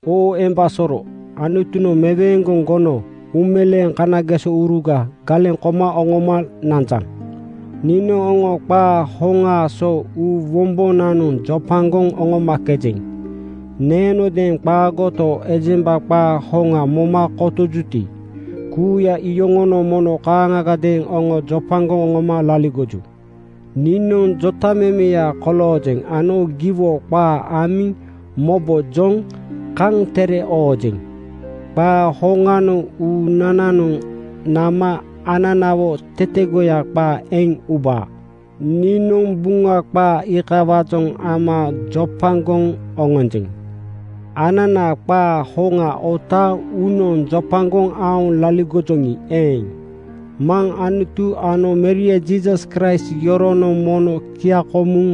Oo emba soro, Anutunoŋ meweeŋgoŋ gono uumeleeŋ kanagesouruga galeŋ koma oŋoma nanjaŋ. Niinoŋ oŋo qaa hoŋaa so uu wombonanoŋ jopagoŋ oŋomakejeŋ. Neenodeeŋ qaagoto, ejemba qaa hoŋa moma kotojuti, kuuya iyoŋonoŋ mono kaaŋagadeeŋ oŋo jopagoŋ oŋoma laligoju. Niinoŋ jotamemeya koloojeŋ ano giwo qaa amiŋ mobojoŋ kaŋ tere oojeŋ. Qaa hoŋanoŋ uunananoŋ nama ananawo tetegoya qaa eŋ ubaa. Niinoŋ Buŋa qaa iikawaajoŋ ama jopagoŋ oŋonjeŋ. Anana qaa hoŋa otaaŋ uunoŋ jopagoŋ aoŋ laligojoŋi eeŋ, Maŋ Anutu ano Meria Jiisas Kraist yoronoŋ mono kiaŋkomuŋ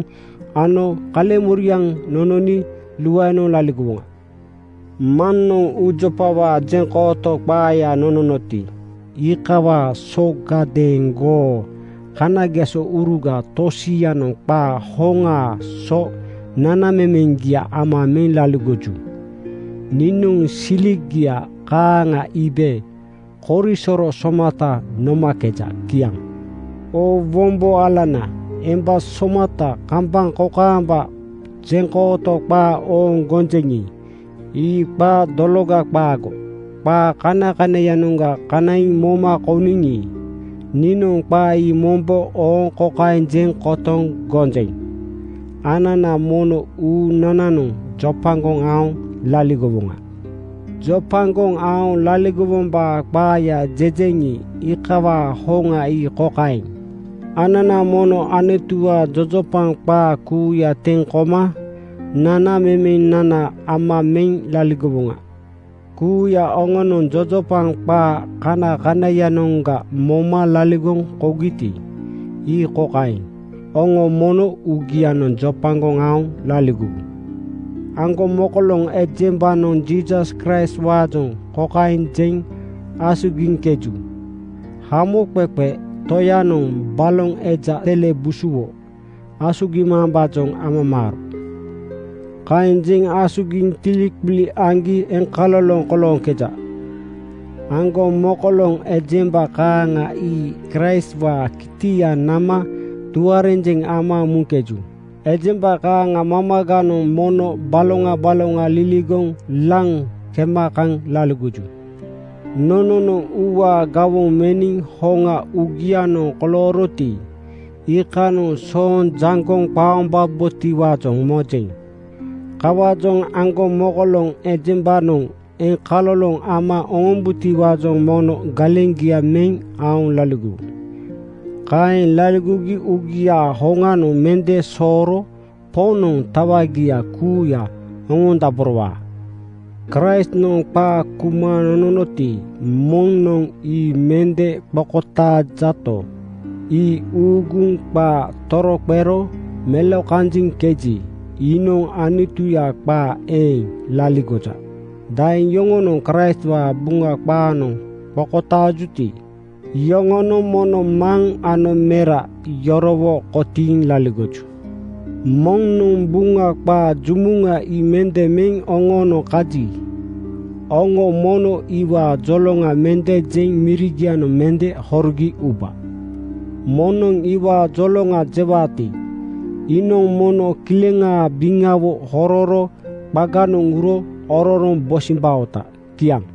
ano kaleŋmoriaŋ nononi luaenoŋ laligowoŋa. Maŋnoŋ uujopawaa jeŋkooto qaaya nononoti, iikawaa sogadeeŋgoo kanagesouruga tosianoŋ qaa hoŋaa so nanamemeŋgia ama meŋ laligoju. Niinoŋ siligia kaaŋa iibe korisoro somata nomakeja. Kiaŋ. Oo wombo alana emba somata, kambaŋ kokaamba jeŋkooto qaa ooŋ gonjeŋi, ii qaa dologa qaago. Qaa kanakanaiyanoŋga kanaiŋ moma kouniŋi, niinoŋ qaa ii mombo ooŋ kokaeŋ jeŋ kotoŋ gonjeŋ: Anana mono uunananoŋ jopagoŋ aoŋ laligowoŋa. Jopagoŋ aoŋ laligowombaa qaaya jejeŋi, iikawaa hoŋa ii kokaeŋ: Anana mono Anutuwaa jojopaŋ qaa kuuya teŋ koma nanamemenana ama meŋ laligowoŋa. Kuuya oŋonoŋ jojopaŋ qaa kanakanaiyanoŋga moma laligoŋ kougiti, ii kokaeŋ: Oŋo mono uugianoŋ jopagoŋ aoŋ laligowu. Aŋgomokoloŋ ejembanoŋ Jiisas Kraistwaajoŋ kokaeŋ jeŋ asugiŋkeju: “Hamoqeqe Toyanoŋ baloŋ eja sele busuwo asugimambaajoŋ amamaaro.” Kaeŋ jeŋ asugiŋ tiliqili aŋgi eŋkaloloŋ kolooŋkeja. Aŋgomokoloŋ ejemba kaaŋa ii Kraistwaa kitia nama tuarenjeŋ ama muŋkeju. Ejemba kaaŋa mamaganoŋ mono baloŋa baloŋa liligoŋ laŋ kema kaŋ laligoju. Nononoŋ uuwaa gawoŋ meniŋ hoŋa uugianoŋ kolooroti, iikanoŋ sooŋ jaŋgoŋ qaombabotiwaajoŋ mojeŋ. Kawaajoŋ aŋgomokoloŋ ejembanoŋ eŋkaloloŋ ama oŋombubotiwaajoŋ mono galeŋgia meŋ aoŋ laligowu. Kaeŋ laligogi uugiaa hoŋanoŋ mende sooro Poŋnoŋ tawagia kuuya oŋondaborowaa. Kraistnoŋ qaa kuma nononoti, moŋnoŋ ii mende qokotaajato, ii uuguŋ qaa toroqero melokanjiŋ jeŋkeji, iinoŋ Anutuya qaa eeŋ laligoja. Daeŋ yoŋonoŋ Kraistwaa Buŋa qaanoŋ qokotaajuti, iyoŋonoŋ mono Maŋ ano Mera yorowo kotiiŋ laligoju. Moŋnoŋ Buŋa qaa jumuŋa ii mende meŋ oŋoonoŋ kaji, oŋo mono iwaa joloŋa mende jeŋ mirigianoŋ mende horogi uba. Moŋnoŋ iwaa joloŋa jewaati, iinoŋ mono kileŋaa biŋawo hororo qaganoŋ uro ororoŋ bosimbaota. Kiaŋ.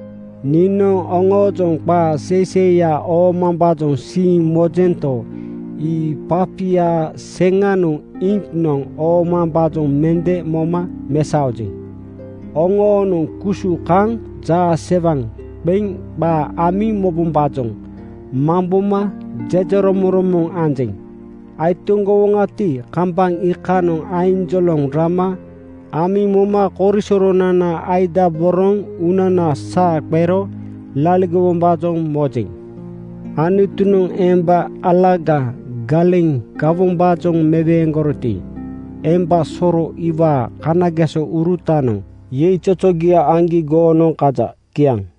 Niinoŋ oŋoojoŋ qaa seiseiya oomambaajoŋ siiŋ mojento, ii papia seŋanoŋ iŋknoŋ oomambaajoŋ mende moma mesaojeŋ. Oŋoonoŋ kusu kaŋ jaasewaŋ qeŋ qaa amiŋ mobombaajoŋ mamboma jejeromoŋromoŋ anjeŋ. Aitoŋgowoŋati, kambaŋ iikanoŋ ainjoloŋ rama amiŋ moma korisoronana asugidaboroŋ uunana saa qero laligowombaajoŋ mojeŋ. Anutunoŋ emba alaga galeŋ gawombaajoŋ meweeŋgoroti, emba soro iwaa kanagesourutanoŋ yeizozogia aŋgi goonoŋ kaja. Kiaŋ.